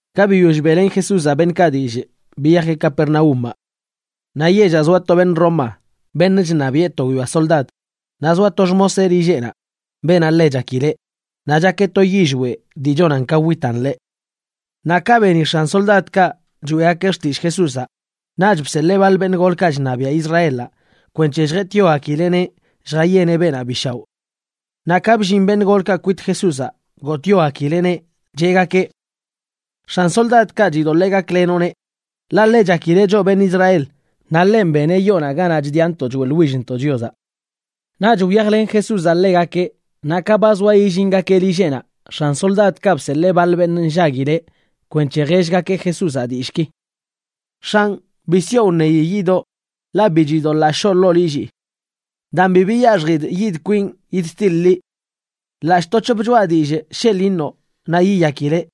Ka biyoll beꞌlen Jesúzaꞌ beṉꞌkaꞌ dillꞌ, biyajeꞌ Capernaúmaꞌ. Naꞌ yellaꞌ zoa to beṉꞌ Roma beṉꞌ chṉabiꞌe to guiyoa soldad, naꞌ zoa to xmoseꞌ lilleꞌnaꞌ, beenaꞌ ḻe chakileꞌ, naꞌ chakeꞌ to yillweꞌ dii chonan ka witan ḻeꞌ. Naꞌ ka beni x̱an soldadkaꞌ choeꞌgakeꞌ xtillꞌ Jesúzaꞌ, naꞌch bseḻee baḻ beṉꞌ golkaꞌ chṉabiaꞌ Israelaꞌ kwenc̱he lljetꞌyogakileꞌneꞌ lljayeneꞌ beenaꞌ bi shaoꞌ. Naꞌ ka bllin beṉꞌ golkaꞌ kwit Jesúzaꞌ, gotꞌyogakileꞌneꞌ, cheꞌgakeꞌ: ―X̱an soldadkaꞌ chidoḻee gaklenoꞌneꞌ, ḻaꞌ ḻe chakileꞌ choꞌ beṉꞌ Israel naꞌ ḻenꞌ beneꞌ yoonaꞌ ganaꞌ chdiꞌantoꞌ choeꞌḻwillntoꞌ Chiozaꞌ. Naꞌch wyajlen Jesúzaꞌ ḻegakeꞌ. Naꞌ ka ba zoa yillingakeꞌ lilleꞌnaꞌ, x̱an soldadkaꞌ bseḻee baḻ beṉꞌ nllaguileꞌ kwenc̱he jellgakeꞌ Jesúzaꞌ dillꞌki: ―X̱anꞌ, bi sioꞌ wṉeyi yidoꞌ, ḻaꞌ bi chidoḻaa shoo ḻoo lillii. Daan bi biyaxjidꞌ yidꞌ kwinꞌ yidtiḻꞌ liꞌ. Ḻaꞌc̱hꞌ to c̱hop choꞌa dillꞌ sheḻꞌ iṉoꞌ naꞌ yiyakileꞌ.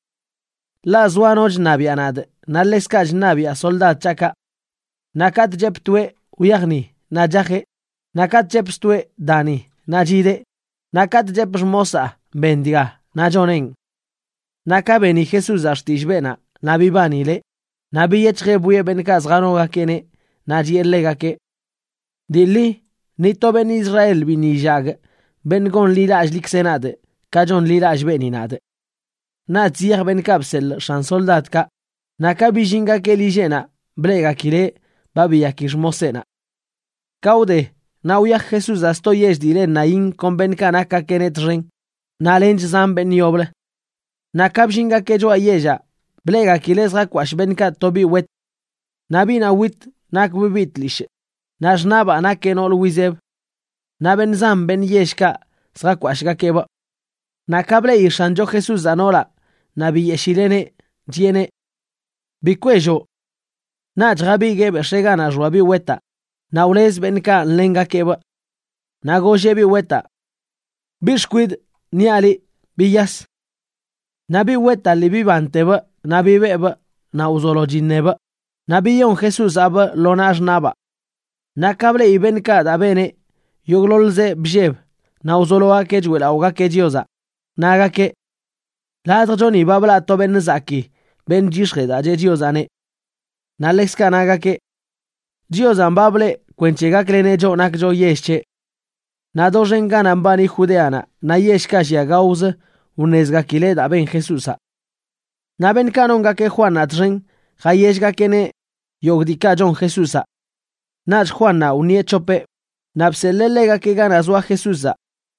Ḻaꞌ zoa no chṉabiaꞌ nadꞌ, naꞌ ḻekzkaꞌ chṉabiꞌa soldad c̱haꞌkaꞌ. Naꞌ katꞌ chepꞌ toeꞌ: “Wyaj ni”, naꞌ chajeꞌ. Naꞌ katꞌ chepꞌ stoeꞌ: “Da ni”, naꞌ chideꞌ. Naꞌ katꞌ chepꞌ xmosaa: “Ben dga”, naꞌ choneꞌn. Naꞌ ka beni Jesúzaꞌ xtillꞌ beenaꞌ naꞌ bibanileꞌ, naꞌ biyec̱hjeꞌ bwieꞌ beṉꞌkaꞌ zjanogakeꞌneꞌ, naꞌ chiꞌe ḻegakeꞌ: ―Dii ḻi, ni to beṉꞌ Israel biṉꞌ illagꞌ beṉꞌ gonḻilallꞌḻikzeꞌ nadꞌ ka chonḻilallꞌ beeni nadꞌ. Naꞌch ziyaj beṉꞌkaꞌ bseḻꞌ x̱an soldadkaꞌ, naꞌ ka billingakeꞌ lilleꞌnaꞌ bleꞌgakileꞌ ba biyaki xmoseꞌnaꞌ. Ka wde, naꞌ wyaj Jesúzaꞌ sto yell dii le Naín kon beṉꞌkaꞌ nakgakeꞌneꞌ txen naꞌ lench zan beṉꞌ yoblə. Naꞌ ka bllingakeꞌ choꞌa yellaꞌ, bleꞌgakileꞌ zjakwashꞌ beṉꞌkaꞌ to biꞌ wet. Naꞌ biꞌnaꞌ wit nakbꞌ biꞌ tlishꞌ, naꞌ xṉaꞌbaa nakeꞌ noolə wizeb. Naꞌ beṉꞌ zan beṉꞌ yellkaꞌ zjakwashꞌgakeꞌbꞌ. Naꞌ ka bleꞌi X̱ancho Jesúzaꞌ noolaꞌ, naꞌ biyeshileꞌneꞌ, chiꞌeneꞌ: ―Bi kwelloꞌ. Naꞌch jabiguee bex̱ee ganaꞌ xoa biꞌ wetaꞌ, naꞌ wlez beṉꞌkaꞌ nḻengakeꞌbꞌ. Naꞌ golleꞌ biꞌ wetaꞌ: ―Biꞌ xkwidꞌ, niaꞌ liꞌ, ¡biyas! Naꞌ biꞌ wetaꞌ lii bibantebꞌ naꞌ bibeꞌbꞌ naꞌ wzolo chiṉebꞌ, naꞌ biyon Jesúzaꞌbꞌ lo naꞌ xṉaꞌbaa. Naꞌ ka bleꞌi beṉꞌkaꞌ daa beneꞌ, yogꞌḻoḻzeꞌ blleb naꞌ wzologakeꞌ choeꞌlaꞌogakeꞌ Chiozaꞌ, nagakeꞌ: ―Ladjchoni ba blaꞌ to beṉꞌ zakii beṉꞌ chyix̱jee daa cheꞌ Chiozaꞌneꞌ. Naꞌ ḻekzkaꞌ nagakeꞌ: ―Chiozanꞌ ba blee kwenc̱he gakleneꞌ choꞌ nakcho yell c̱heꞌ. Naꞌ doxen ganaꞌ mbani Judeanaꞌ naꞌ yellkaꞌ llia gaozə wṉezgakileꞌ daa ben Jesúzaꞌ. Naꞌ beṉꞌkaꞌ nongakeꞌ Juannaꞌ txen jayellgakeꞌneꞌ yogꞌ diikaꞌ chon Jesúzaꞌ. Naꞌch Juannaꞌ wṉieꞌ c̱hopeꞌ naꞌ bseḻee ḻegakeꞌ ganaꞌ zoa Jesúzaꞌ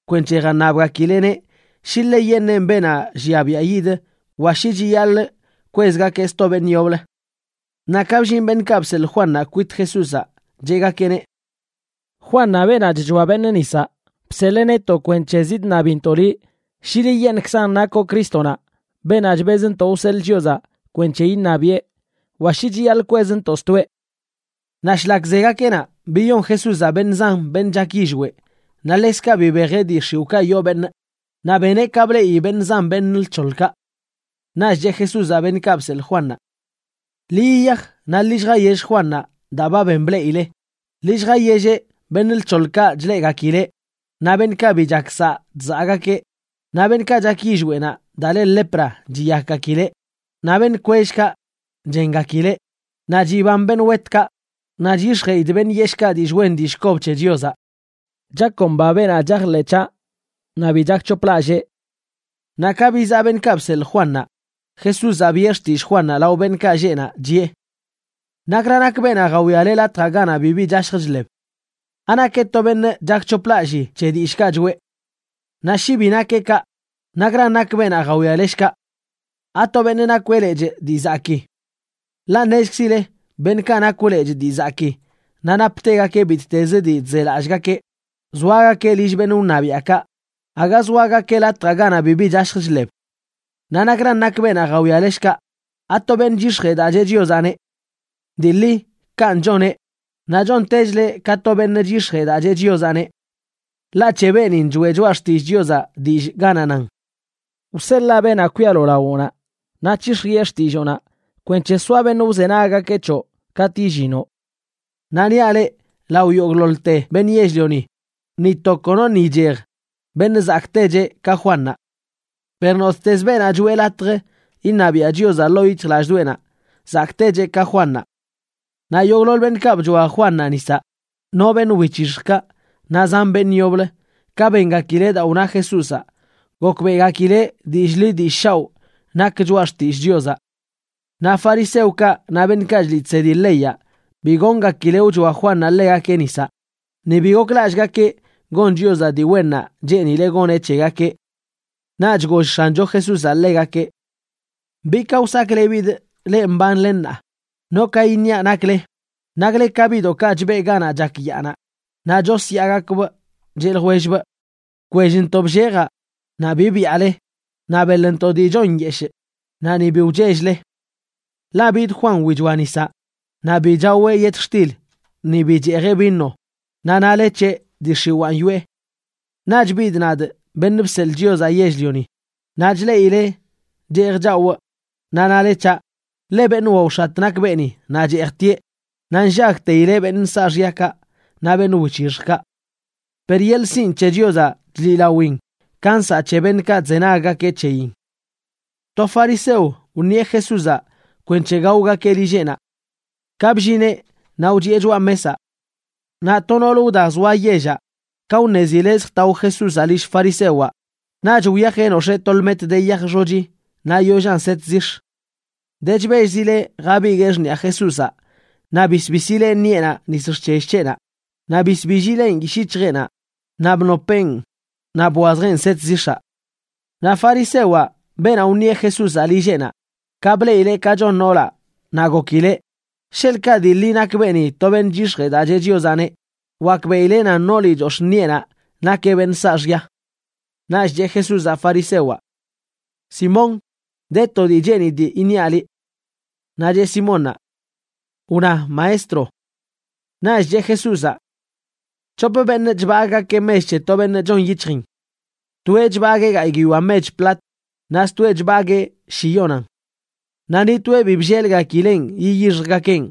kwenc̱he jaṉabgakileꞌneꞌ shi ḻeyeṉꞌenꞌ beenaꞌ llia biaꞌ yid wa shi chiyaḻꞌ kwezgakeꞌ sto beṉꞌ yoblə. Naꞌ ka bllin beṉꞌkaꞌ bseḻꞌ Juannaꞌ kwit Jesúzaꞌ, cheꞌgakeꞌneꞌ: ―Juannaꞌ, beenaꞌ chchoa beṉꞌ nisaꞌ, bseḻee netoꞌ kwenc̱he zidṉabintoꞌ liꞌ shi liꞌyeṉꞌkzan nakoꞌ Crístonaꞌ, beenaꞌ chbezntoꞌ wseḻꞌ Chiozaꞌ kwenc̱he iṉabiꞌe, wa shi chiyaḻꞌ kwezntoꞌ stoeꞌ. Naꞌ shlak zegakeꞌ naꞌ, biyon Jesúzaꞌ beṉꞌ zan beṉꞌ chak yillweꞌ, naꞌ ḻekzkaꞌ bibejeꞌ dii x̱iwꞌkaꞌ yoo beṉꞌ, naꞌ beneꞌ ka bleꞌi beṉꞌ zan beṉꞌ lc̱hoḻkaꞌ. Naꞌch cheꞌ Jesúzaꞌ beṉꞌkaꞌ bseḻꞌ Juannaꞌ: ―Ḻi yiyaj naꞌ ḻi lljayell Juannaꞌ daa ba ben bleꞌile. Ḻi lljayelleꞌ beṉꞌ lc̱hoḻkaꞌ chleꞌgakileꞌ, naꞌ beṉꞌkaꞌ bi chak saꞌ chzaꞌgakeꞌ, naꞌ beṉꞌkaꞌ chak yillweꞌnaꞌ daa le lepra chiyakgakileꞌ, naꞌ beṉꞌ kwellkaꞌ chengakileꞌ, naꞌ chiban beṉꞌ wetkaꞌ, naꞌ chyix̱jeꞌidꞌ beṉꞌ yeshꞌkaꞌ dillꞌ wen dillꞌ kob c̱he Chiozaꞌ. Chakomba beenaꞌ chajḻeꞌ c̱haꞌ naꞌ bi chakc̱hoplallee. Naꞌ ka bizaꞌ beṉꞌkaꞌ bseḻꞌ Juannaꞌ, Jesúzaꞌ biꞌe xtillꞌ Juannaꞌ lao beṉꞌkaꞌ lleꞌ naꞌ, chiꞌe: ―¿Nakra nak beenaꞌ jawiale latjaꞌ ganaꞌ bibi chashj chḻeb? ¿Anakeꞌ to beṉꞌ chakc̱hoplallii c̱he dillꞌkaꞌ choꞌe? Naꞌ shi bi nakeꞌ kaꞌ, ¿nakran nak beenaꞌ jawiale, shkaꞌ? ¿Ato beṉꞌ nakweꞌ lechꞌ dii zakii? Ḻaꞌ ṉezkzile beṉꞌkaꞌ nakw lechꞌ dii zakii, naꞌ naptegakeꞌ bittezə dii chzelallꞌgakeꞌ, zoagakeꞌ lill beṉꞌ wṉabiaꞌkaꞌ, aga zoagakeꞌ latjaꞌ ganaꞌ bibi chashj chḻeb. Naꞌ ¿nakran nak beenaꞌ jawiale, shkaꞌ? ¿Ato beṉꞌ chyix̱jee daa cheꞌ Chiozaꞌneꞌ? Dii ḻi kanꞌ choneꞌ, naꞌ chontechleꞌ ka to beṉꞌ chyix̱jee daa cheꞌ Chiozaꞌneꞌ. Ḻaꞌ c̱he beenin choꞌe Choꞌa Xtillꞌ Chiozaꞌ dillꞌ ganaꞌ nan: Wseḻaa beenaꞌ kwialo lawoꞌnaꞌ, naꞌ c̱hix̱jiꞌe xtilloonaꞌ kwenc̱he soa beṉꞌ wzenaggakeꞌ c̱hoꞌ katꞌ illinoꞌ. Naꞌ niaꞌ leꞌ, lao yogꞌḻoḻte beṉꞌ yell-lioni, ni to konoṉꞌ ichej beṉꞌ zakꞌtecheꞌ ka Juannaꞌ. Per nottezə beenaꞌ choeꞌ latj iṉabiaꞌ Chiozaꞌ ḻoo yic̱hjlallꞌdoꞌenaꞌ, zakꞌtecheꞌ ka Juannaꞌ. Naꞌ yogꞌḻoḻ beṉꞌkaꞌ bchoa Juannaꞌ nisaꞌ, no beṉꞌ wic̱hixjkaꞌ naꞌ zan beṉꞌ yoblə, ka bengakileꞌ daa wna Jesúzaꞌ, gokbeꞌgakileꞌ dillꞌ ḻi dillꞌ shaoꞌ nak choꞌa xtillꞌ Chiozaꞌ. Naꞌ fariseokaꞌ naꞌ beṉꞌkaꞌ chliꞌ chsedi leyaꞌ bi goongakileꞌ wchoa Juannaꞌ ḻegakeꞌ nisaꞌ, ni bi goklallꞌgakeꞌ gon Chiozaꞌ dii wennaꞌ cheenileꞌ goneꞌ c̱hegakeꞌ. Naꞌch goll X̱ancho Jesúzaꞌ ḻegakeꞌ: ―¿Bi ka wsaklebidꞌ leꞌ mbanle ṉaa? ¿No ka iṉiaꞌ nakle? Nakle ka biꞌdoꞌkaꞌ chbeꞌ ganaꞌ chak yaanaꞌ naꞌ chosyaagakbꞌ cheꞌ ljwellbꞌ: “Bkwellntoꞌ bllejaꞌ naꞌ bi byaale, naꞌ beḻntoꞌ dii chon nyeshꞌ, naꞌ ni bi wchell-le.” Ḻaꞌ bid Juan wichoa nisaꞌ, naꞌ bi chaweꞌ yetxtil ni bi cheejeꞌ vino, naꞌ nale c̱heꞌ: “Dii x̱iwaan yoꞌe.” Naꞌch bidꞌ nadꞌ, Beṉꞌ Bseḻꞌ Chiozaꞌ Yell-lioni, naꞌ chleꞌile cheej chawꞌ, naꞌ nale c̱haꞌ: “Ḻe beṉꞌ waox̱at nak beeni naꞌ cheejtieꞌ, naꞌ nllagteileꞌ beṉꞌ saaxyakaꞌ naꞌ beṉꞌ wic̱hixjkaꞌ.” Per yeḻꞌ sinꞌ c̱he Chiozaꞌ chliꞌlawin ka nsaꞌ c̱he beṉꞌkaꞌ chzenaggakeꞌ c̱heyin. To fariseo wṉieꞌ Jesúzaꞌ kwenc̱he gaogakeꞌ lilleꞌnaꞌ. Ka bllineꞌ naꞌ wchiꞌe choꞌa mesaꞌ. Naꞌ to noolə wda zoa yellaꞌ, ka wṉezileꞌ zjtao Jesúzaꞌ lill farisewaꞌ, naꞌch wyajeꞌ nox̱ee to lmet de yaj xochi naꞌ yollan set zix̱. De chbellzileꞌ jabiguee xṉiꞌa Jesúzaꞌ naꞌ bisbisileꞌ ṉiꞌenaꞌ nis xc̱hell c̱heꞌnaꞌ. Naꞌ bisbillileꞌn yishꞌ yic̱hjeꞌnaꞌ, naꞌ bnopeꞌn naꞌ bwazjeꞌn set zix̱aꞌ. Naꞌ farisewaꞌ, beenaꞌ wṉieꞌ Jesúzaꞌ lilleꞌnaꞌ, ka bleꞌileꞌ ka chon noolaꞌ, naꞌ gokileꞌ: “Sheḻꞌkaꞌ dii ḻi nak beeni to beṉꞌ chyix̱jee daa cheꞌ Chiozaꞌneꞌ, wakbeꞌileꞌ nan nooli chox̱ꞌ ṉiꞌenaꞌ nakeꞌ beṉꞌ saaxya.” Naꞌch cheꞌ Jesúzaꞌ farisewaꞌ: ―Simón, de to dii cheenidꞌ iṉiaꞌ liꞌ. Naꞌ cheꞌ Simónnaꞌ: ―Wna, Maestro. Naꞌch cheꞌ Jesúzaꞌ: ―C̱hop beṉꞌ chbagꞌgakeꞌ mech c̱he to beṉꞌ chon yic̱hjin. Toeꞌ chbaguee gayꞌ guiyoa mech plata, naꞌ stoeꞌ chbaguee shiyonan. Naꞌ ni toeꞌ bi bllelgakileꞌn yiyixjgakeꞌn.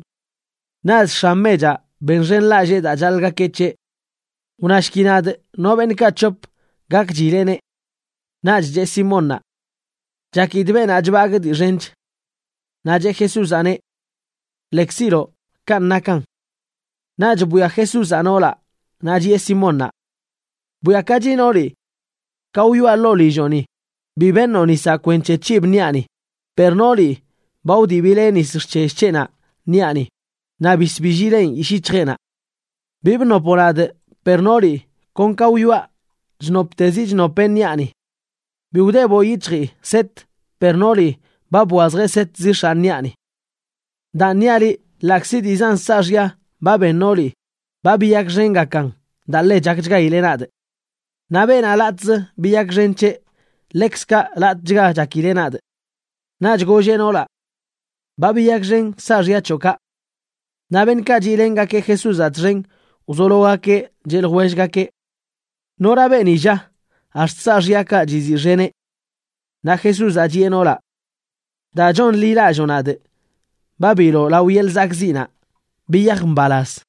Naꞌch x̱an mechaꞌ benxenlallee daa chaḻꞌgakeꞌ c̱heꞌ. Wnashki nadꞌ, ¿no beṉꞌkaꞌ c̱hop gakchileꞌneꞌ? Naꞌch cheꞌ Simónnaꞌ: ―Chakidꞌ beenaꞌ chbagꞌ dii xench. Naꞌ cheꞌ Jesúzaꞌneꞌ: ―Lekziloꞌ, kanꞌ nakan. Naꞌch bwia Jesúzaꞌ noolaꞌ naꞌ chiꞌe Simónnaꞌ: ―Bwiakachi nooli. Ka wyoꞌa ḻoo lilloꞌni bi beṉoꞌ nisaꞌ kwenc̱he c̱hib ṉiꞌani, per nooli ba wdibileꞌ nis xc̱hell c̱heꞌnaꞌ ṉiꞌani naꞌ bisbillileꞌn yishꞌ yic̱hjeꞌnaꞌ. Bi bnopoꞌ nadꞌ, per nooli kon ka wyoꞌa chnoptezi chnopeꞌ ṉiꞌani. Bi wdeboꞌ yic̱hjii set, per nooli ba bwazjeꞌ set zix̱aꞌ ṉiꞌani. Daan niaꞌ liꞌ, ḻaꞌkzi dii zan saaxya ba ben nooli, ba biyakxengakan daa ḻe chakchgaileꞌ nadꞌ. Naꞌ beenaꞌ latꞌzə biyakxen c̱heꞌ, ḻekzkaꞌ latꞌchga chakileꞌ nadꞌ. Naꞌch golleꞌ noolaꞌ: ―Ba biyakxen saaxya c̱hoꞌkaꞌ. Naꞌ beṉꞌkaꞌ chiꞌlengakeꞌ Jesúzaꞌ txen wzologakeꞌ cheꞌ ljwellgakeꞌ: ―¿Nora beeni, lla, ax̱t saaxyakaꞌ chiziꞌxeneꞌ? Naꞌ Jesúzaꞌ chiꞌe noolaꞌ: ―Daa chonḻilalloo nadꞌ, ba biloꞌ lao yeḻꞌ zakꞌziꞌnaꞌ. Biyaj mbalaz.